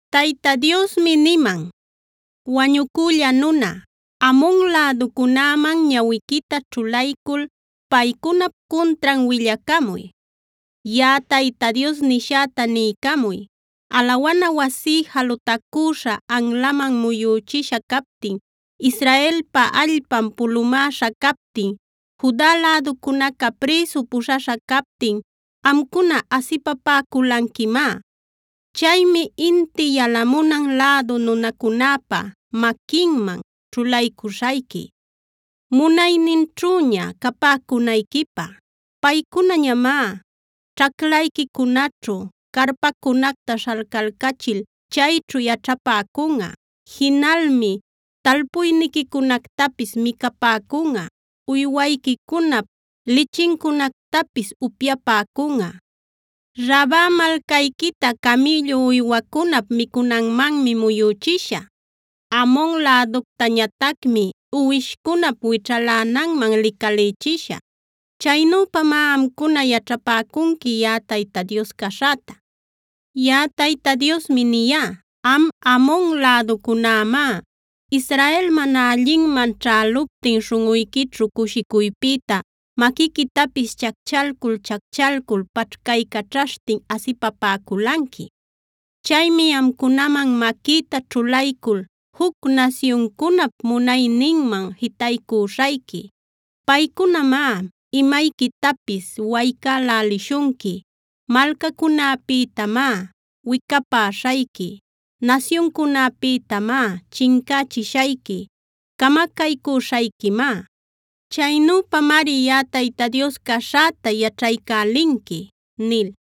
Tayta Diosmi niman: “Wañucülla nuna, Amon läducunäman ñawiquita ćhulaycul paycunap cuntran willacamuy. Yaꞌa Tayta Dios nishäta niycamuy: Alawana wasí jalutacüśha anlaman muyüchisha captin, Israelpa allpan pulumäśha captin, Juda läducunaca prïsu puśhaśha captin amcuna asipapäculanquimá. Chaymi inti yalamunan lädu nunacunäpa maquinman ćhulaycüśhayqui, munayninćhüña capäcunayquipä. Paycunañamá ćhaclayquicunaćhu carpancunacta śhalcalcachil chayćhu yaćhapäcunꞌa. Jinalmi talpuyniquicunactapis micapäcunꞌa, uywayquicunap lichincunactapis upyapäcunꞌa. Raba malcayquita camïllu uywacunap micunanmanmi muyüchishä. Amon läductañatacmi uwishcunap wićhalänanman licalïchishä. Chaynüpamá amcuna yaćhapäcunqui yaꞌa Tayta Dios caśhäta. Yaꞌa Tayta Diosmi niyá: Am Amon läducunämá, Israel mana allinman ćhäluptin śhunꞌuyquićhu cushicuypïta maquiquitapis chacchalcul-chacchalcul paćhcaycaćhaśhtin asipapäculanqui. Chaymi amcunaman maquïta ćhulaycul juc nasyuncunap munayninman jitaycüśhayqui. Paycunamá imayquitapis waycälälishunqui. Malcacunäpïtamá wicapäśhayqui, nasyuncunäpïtamá chincächishayqui. ¡Camacaycüśhayquimá! Chaynüpamari yaꞌa Tayta Dios caśhäta yaćhaycälinqui” nil.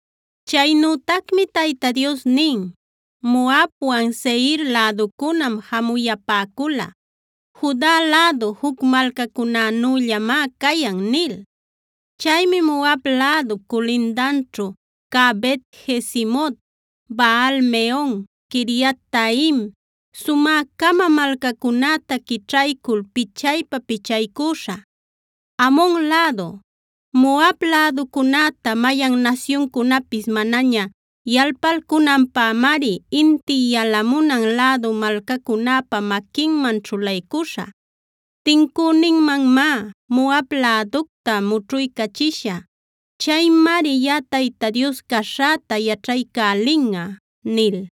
Chaynütacmi Tayta Dios nin: “Moabwan Seir läducunam jamuyapäcula: ‘Juda lädu juc malcacunänüllamá cayan’ nil. Chaymi Moab lädup culindanćhu cä Bet-jesimot, Baal-meon, Quiriataim sumä-cama malcacunäta quićhaycul pichaypa-pichaycüśhä. Amon lädu, Moab läducunäta mayan nasyuncunapis manaña yalpalcunanpämari inti yalamunan lädu malcacunäpa maquinman ćhulaycuśhä. Tincüninmanmá Moab läducta mućhuycachishä. Chaymari yaꞌa Tayta Dios caśhäta yaćhaycälinꞌa” nil.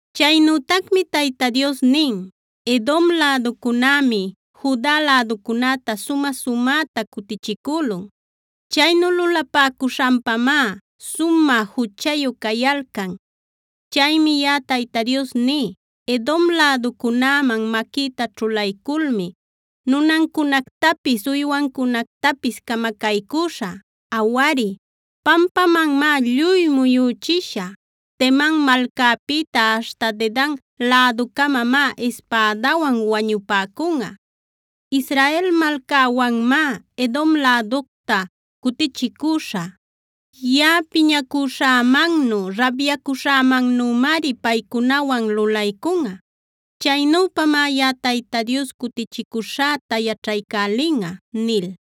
Chaynütacmi Tayta Dios nin: “Edom läducunämi Juda läducunäta sumä-sumäta cutichicülun. Chaynu lulapäcuśhanpamá sumä juchayu cayalcan. Chaymi yaꞌa Tayta Dios ní: Edom läducunäman maquïta ćhulayculmi nunancunactapis, uywancunactapis camacaycüśhä. Awari, pampamanmá lluy muyüchishä. Teman malcapïta aśhta Dedan läducamamá ispädawan wañupäcunꞌa. Israel malcäwanmá Edom läducta cutichicüśhä. Yaꞌa piñacuśhämannu, rabyacuśhämannümari paycunawan lulaycunꞌa. Chaynüpamá yaꞌa Tayta Dios cutichicuśhäta yaćhaycälinꞌa” nil.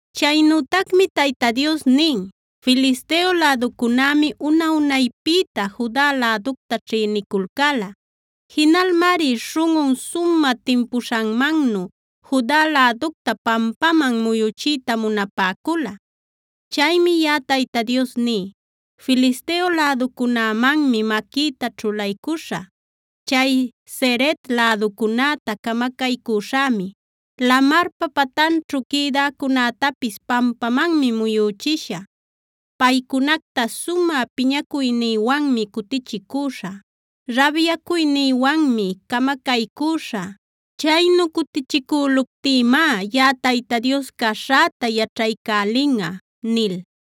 Chaynütacmi Tayta Dios nin: “Filisteo läducunämi una-unaypïta Juda läducta ćhïniculcäla. Jinalmari śhunꞌun sumä timpuśhanmannu Juda läducta pampaman muyuchiyta munapäcula. Chaymi yaꞌa Tayta Dios ní: Filisteo läducunämanmi maquïta ćhulaycuśhä. Chay Cereta läducunäta camacaycüśhämi; lamarpa patanćhu quïdäcunätapis pampamanmi muyüchishä. Paycunacta sumä piñacuynïwanmi cutichicüśhä; rabyacuynïwanmi camacaycüśhä. Chaynu cutichicüluptïmá yaꞌa Tayta Dios caśhäta yaćhaycälinꞌa” nil.